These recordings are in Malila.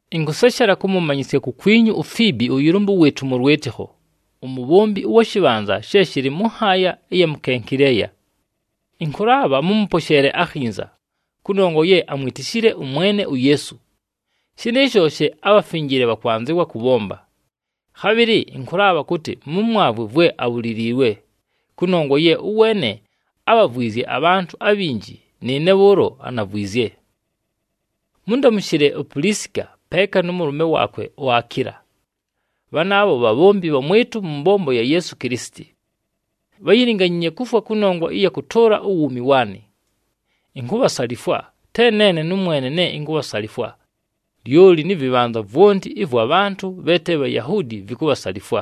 Ɨnkʉseshela kʉmʉmanyɨsya kukwinyu uFiibi ʉyɨlʉmbʉ wɨɨtʉ mʉ lwɨtɨkho, umubhombi ʉwa shɨbhanza she shɨlɨ mʉ nhaaya ɨya mu Kenkileya. Ɨnkʉlaabha mʉmʉposheele akhinza, kʉnongwa ye amwitishile ʉMwene uYeesu. Shɨnɨɨsho she abhafinjile bhakwanzɨwa kʉbhomba. Khabhɨlɨ ɨnkʉlaabha kʉtɨ mʉmwavwe vwe abhuliliilwe, kʉnongwa ye ʉweene ábhavwizye abhantʉ abhinji, nɨɨne bhʉʉlo anavwizye. Mʉndamʉshɨle uPulisika peeka nʉ mʉlʉme waakwe uAkiila. Bhanaabho bhabhombi bhamwɨtʉ mʉ mbombo ya Yeesu Kilisiti. Bháyilinganyiinye kufwa kʉnongwa ɨya kʉtʉʉla uwuumi waanɨ. Inkubhasalifwa, te neene nʉmwene ne inkubhasalifwa, lyoli nɨ vɨbhanza vwonti ɨvwa bhantʉ bhe te Bhayahuudi vikubhasalifwa.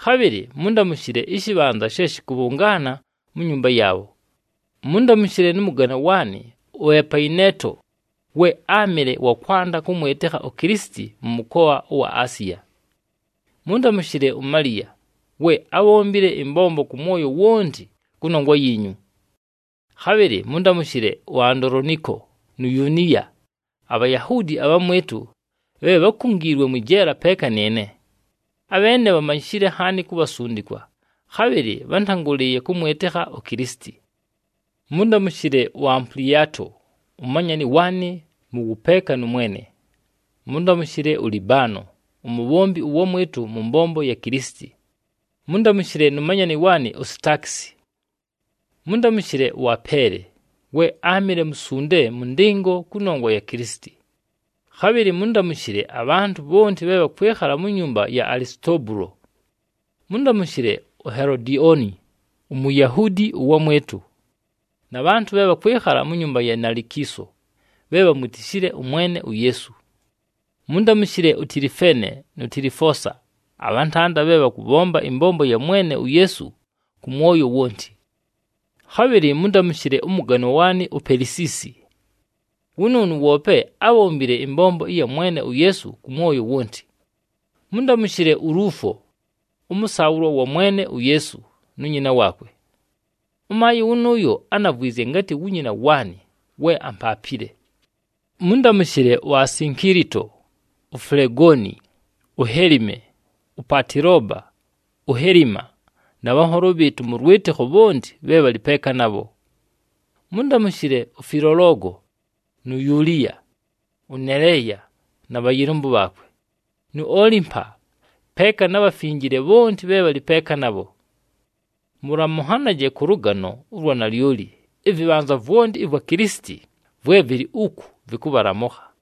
Khabhɨlɨ mʉndamʉshɨle ɨshɨbhanza she shɨkʉbhʉngaana mu nyumba yaabho. Mʉndamʉshɨle nʉ mʉganwa waanɨ uEpayineeto, we áamɨle wa kwanda kʉmwɨtɨkha uKilisiti mʉ mʉkoa ʉwa Asiya. Mʉndamʉshɨle uMaliya, we ábhombile ɨmbombo kʉ mwoyo wonti kʉnongwa yiinyu. Khabhɨlɨ mʉndamʉshɨle uAndoloniko nu Yuniya, aBhayahuudi abhamwɨtʉ, bhe bhákungiilwe mwɨ jeela peeka nɨɨne. Abheene bhamanyishile nhaani ku bhasundikwa, khabhɨlɨ bhántangʉlɨɨye kʉmwɨtɨkha uKilisiti. Mʉndamʉshɨle uAmpuliato, umanyani waanɨ mʉ wʉpeeka nʉ Mwene. Mʉndamʉshɨle uLibano umubhombi ʉwamwɨtʉ mʉ mbombo ya Kilisiti. Mʉndamʉshɨle nu manyani waanɨ uSitaakisi. Mʉndamʉshɨle ʉApeele, we áamɨle musunde mʉ ndɨngo kʉnongwa ya Kilisiti. Khabhɨlɨ mʉndamʉshɨle abhantʉ bhonti bhe bhakwɨkhala mu nyumba ya Alisitobulo. Mʉndamʉshɨle uHelodioni, uMuyahuudi ʉwamwɨtʉ, na bhantʉ bhe bhakwɨkhala mu nyumba ya Nalikiiso, bhe bhamwitishile ʉMwene uYeesu. Mʉndamʉshɨle uTilifeene nu Tilifoosa abhantanda bhe bhakʉbhomba ɨmbombo ya Mwene uYeesu kʉ mwoyo wonti. Khabhɨlɨ mʉndamʉshɨle ʉmʉganwa waanɨ uPelisiisi. Wʉnʉʉnʉ woope ábhombile ɨmbombo ɨya Mwene uYeesu kʉ mwoyo wonti. Mʉndamʉshɨle uLuufo, ʉmʉsaabhʉlwa wa Mwene uYeesu, nu nyina waakwe. Ʉmaayɨ wʉnʉʉyo ánavwizye ngatɨ wu nyina waanɨ we ampaapile. Mʉndamʉshɨle uAsinkilito, uFulegoni, uHelime, uPatiloba, uHelima, na bhanholo bhɨɨtʉ mʉ lwɨtɨkho bhonti bhe bhalɨ peeka nabho. Mʉndamʉshɨle uFilologo nu Yuliya, ʉNeleya na bhayɨlʉmbʉ bhaakwe, nu Olimpa, peeka na bhafinjile bhonti bhe bhalɨ peeka nabho. Mʉlamʉnhanaje kʉ lʉgano ʉlwa nalyoli. Ɨvɨbhanza vwonti ɨvwa Kilisiti vwe vɨlɨ uku vɨkʉbhalamʉkha.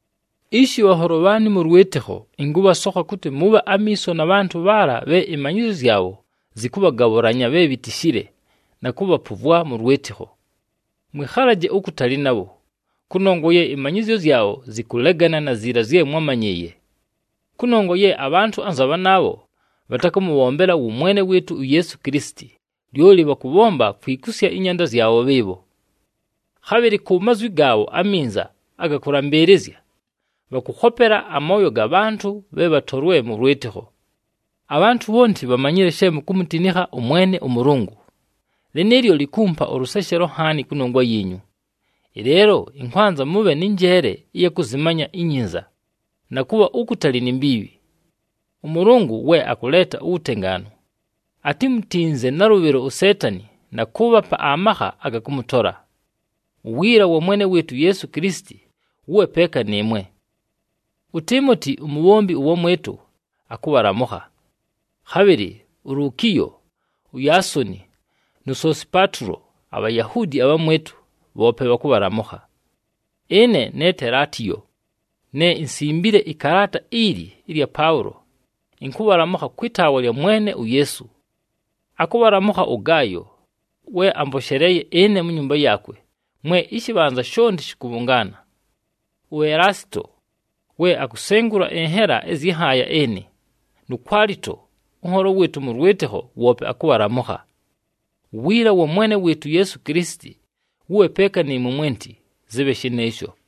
Ishi, bhanholo bhaanɨ mʉ lwɨtɨkho, ɨnkʉbhasokha kʉtɨ mʉbhe amiiso na bhantʉ bhaala bhe ɨmanyɨzyo zyabho zɨkʉbhagabhʉlanya bhe bhitishile, na kʉbhapʉvwa mʉ lwɨtɨkho. Mwɨkhalaje ukutali nabho, kʉnongwa ye ɨmanyɨzyo zyabho zɨkʉlegana na ziila zye mwámanyɨɨye. Kʉnongwa ye abhantʉ anza bhanaabho bhatakʉmʉbhombela wʉ Mwene wɨɨtʉ uYeesu Kilisiti, lyoli bhakʉbhomba kwikusya ɨnyanda zyabho bhɨɨbho. Khabhɨlɨ ku mazwi gaabho aminza aga kʉlambɨɨlɨzya, bhakʉkhopela amooyo aga bhantʉ bhe bhatolwe mʉ lwɨtɨkho. Abhantʉ bhonti bhamanyile she mukumutinikha ʉMwene ʉMʉlʉngʉ. Lɨnɨɨlyo likumpa ʉlʉseshelo nhaani kʉnongwa yiinyu. Ɨleelo ɨnkwanza mʉbhe nɨ njeele ɨya kʉzɨmanya inyinza, na kʉbha ukutali ni mbiibhi. ɄMʉlʉngʉ we akʉleeta uwutengaanu atimutinze nalʉbhɨlo uSeetani na kʉʉbhapa amakha aga kʉmʉtola. Uwiila wa Mwene wɨɨtʉ uYeesu Kilisiti wʉbhe peeka nɨɨmwe. UTiimoti, umubhombi ʉwamwɨtʉ, akʉbhalamʉkha. Khabhɨlɨ uLukiyo, uYaasoni nu Sosipatulo aBhayahuudi abhamwɨtʉ, bhoope bhakʉbhalamʉkha. Ɨne ne Telatiyo, ne insimbile ɨkalaata ili ɨlya Paʉlo, ɨnkʉbhalamʉkha kwɨ taawa lya Mwene uYeesu. Akʉbhalamʉkha ʉGaayo, we amposheleeye ɨne mu nyumba yaakwe, mwe ɨshɨbhanza shonti shɨkʉbhʉngaana. UElaasito, we akusengula ɨnhela ɨzyɨ nhaaya ɨnɨ, nu Kwalito, ʉnholo wɨɨtʉ mʉ lwɨtɨkho woope akʉbhalamʉkha. [ Uwiila wa Mwene wɨɨtʉ uYeesu Kilisiti wʉbhe peeka nɨɨmwe mwenti. Zɨbhe shɨnɨɨsho.]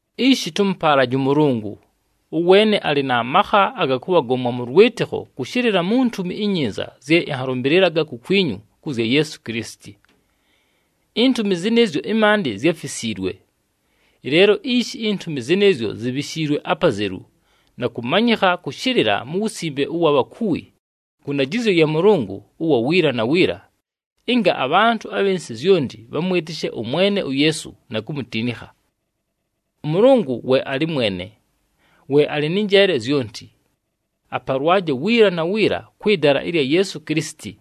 Ishi, tʉmʉpaalaje ʉMʉlʉngʉ! Ʉweene alɨ na makha aga kʉbhagomwa mʉ lwɨtɨkho kʉshɨlɨla mu Ntumi iNyinza zye ɨnhalʉmbɨlɨlaga kukwinyu kʉ zya Yeesu Kilisiti. Intumi zɨnɨɨzyo ɨmaandɨ zyáfisiilwe. Ɨleelo ishi intumi zɨnɨɨzyo zibhishiilwe apazelu, na kʉmanyɨkha kʉshɨlɨla mu wusimbe ʉwa bhakuwi kʉ ndajɨzyo ya Mʉlʉngʉ ʉwa wiila na wiila, ɨnga abhantʉ abhɨ nsɨ zyonti bhamwɨtɨshe ʉMwene uYeesu na kumutinikha. ɄMʉlʉngʉ we alɨ mwene, we alɨ nɨ njeele zyonti. Apalwaje wiila na wiila kwɨ dala ɨlya Yeesu Kilisiti!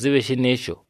Zɨbhe shɨnɨɨsho.